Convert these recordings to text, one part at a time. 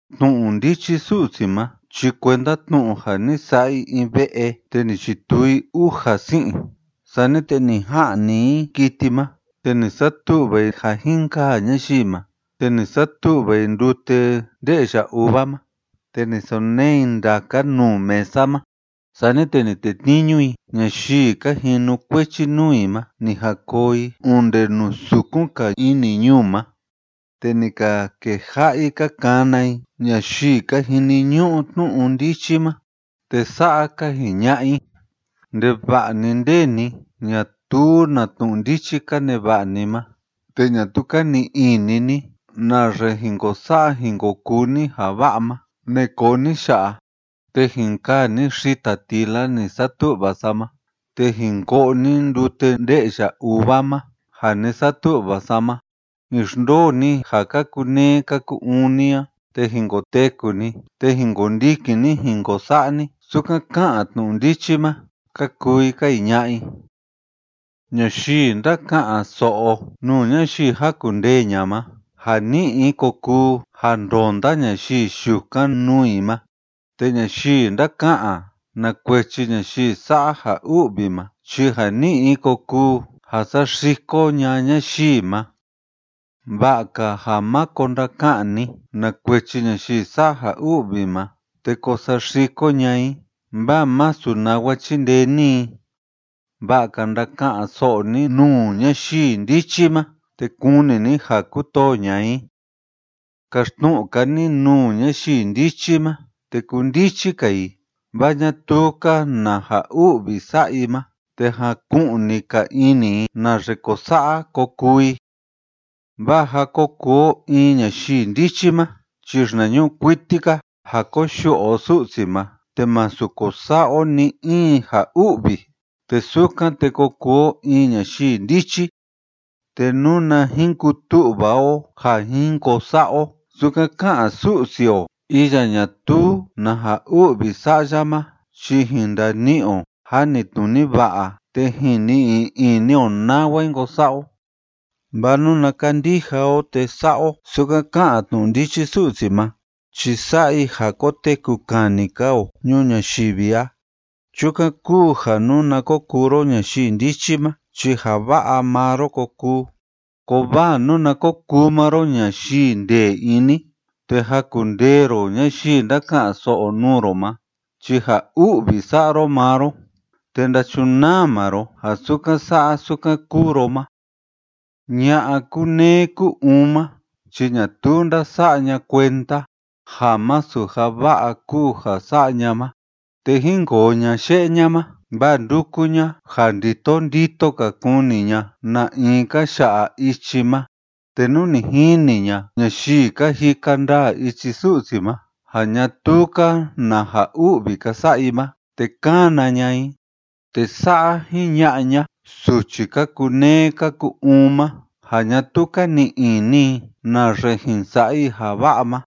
Tnu'u ndichi Su'si ma chi kuenda tnu'u ja ni sa'a i in ve'e te ni chituu i uja si'in, sani te ni ja'ni i kiti i ma te ni satu'va i ja jin kaa ñayii ma, te ni satu'va i ndute nde'ya uva ma te ni sonee i ndaka nuu mesa ma. Sani te ni tetniñu i ñayii ka jinukuechi nuu i ma ni jan koo i onde nuu sukun‑ka ini ñuu ma, te ni ka keja'a i ka kana i ñayii ka jiniñu'u tnu'u ndichi ma. Te sa'a ka jiña'a i: “Ndeva'a‑ni nde ni ñatuu na tnu'u ndichi ka neva'a ni ma te ñatuu ka ni'i ini ni naxe jin ko sa'a jin ko kuu ni ja va'a ma, ne'e koo ni ya'a, te jin kaa ni xita tila ni satu'va sa ma te jin ko'o ni ndute nde'ya uva ma ja ni satu'va sa ma. Jin xndoo ni ja ka kuneé ka ku‑uun ni a te jin koteku ni te jin kondikin ni jin ko sa'a ni sukan ká'an tnu'u ndichi ma”, ka kuu i ka jiña'a i. Ñayii ndáka'an‑so'o nuu ñayii jakundee ña'a ma, ja ni'i i kokuu ja ndonda ñayii yukan nuu i ma, te ñayii ndáka'an na kuechi ñayii sa'a ja u'vi ma chi ja ni'i i kokuu ja saxiko ña'a ñayii ma. Va'a‑ka ja máko ndaka'an ni na kuechi ñayii sa'a ja u'vi ma te ko saxiko ña'a i, vaa masu nawa chindee ni i. Va'a‑ka ndaka'an‑so'o ni nuu ñayii ndichi ma te kuni ni ja kutoo ña'a i. Kaxtnu'u‑ka ni nuu ñayii ndichi ma, te kundichi‑ka i, vaa ñatuu‑ka na ja u'vi sa'a i ma, te jaku'ni‑ka ini i naxe ko sa'a ko kuu i, Vaa ja ko kuu o in ñayii ndichi ma chi xinañu'u kuiti‑ka ja koyu'u o Su'si ma te másu ko sa'a o ni‑in ja u'vi te sukan te ko kuu o in ñayii ndichi. Te nuna jin kutu'va o ja jin ko sa'a o sukan ká'an Su'si o iya ñatuu na u'vi sa'a ya ma chi jin ndani'i o janitnuni va'a te jin ni'i ini o nawa jin ko sa'a o. Vaa nuna kandija o te sa'a o sukan ká'an tnu'u ndichi Su'si ma chi sa'a i ja koteku kani‑ka o ñuu ñayivi a. Chukan kúu ja nuna ko kuu ro ñayii ndichi ma chi ja va'a maa ro ko kuu, kovaa nuna ko kuu maa ro ñayii ndee ini te jakundee ro ñayii ndáka'an‑so'o nuu ro ma chi ja u'vi sa'a ro maa ro te ndachunaa maa ro ja sukan sa'a sukan kúu ro ma. Ña'a kúneé kú‑uun ma chi ñatuu ndása'a ña kuenda ja masu ja va'a kúu ja sa'a ña ma, te jínkoo ña ye'e ña ma, vaa ndúku ña ja ndito ndito‑ka kuni ña na in ka ya'a ichi ma, te nú ni jini ña ñayii ka jika ndaa ichi Su'si ma ja ñatuu‑ka na u'vi ka sa'a i ma, te kána ña i, te sa'a jiña'a ña suchi ka kuneé ka ku‑uun ma ja ñatuu ka ni'i ini i naxe jin sa'a i ja va'a ma: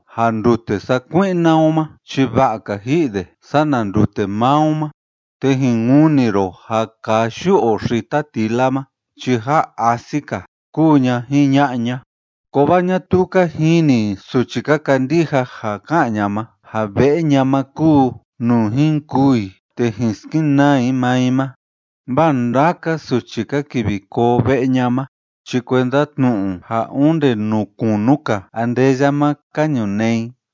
ja ndute sakui'na o ma chi va'a‑ka ji'i de sana ndute maa o ma, te jin kuni ro ja kaa yu'u o xtatila ma chi jaa asi‑ka”, kuu ña jiña'a ña. Kovaa ñatuu ka jini suchi ka kandija ja ká'an ña ma ja ve'e ña ma kúu nuu jin kûu i te jin skenaa i maa i ma, vaa ndaka suchi ka kivi koo ve'e ña ma chi kuenda tnu'u ja onde nuu kunu‑ka andeya ma ka ñunee i.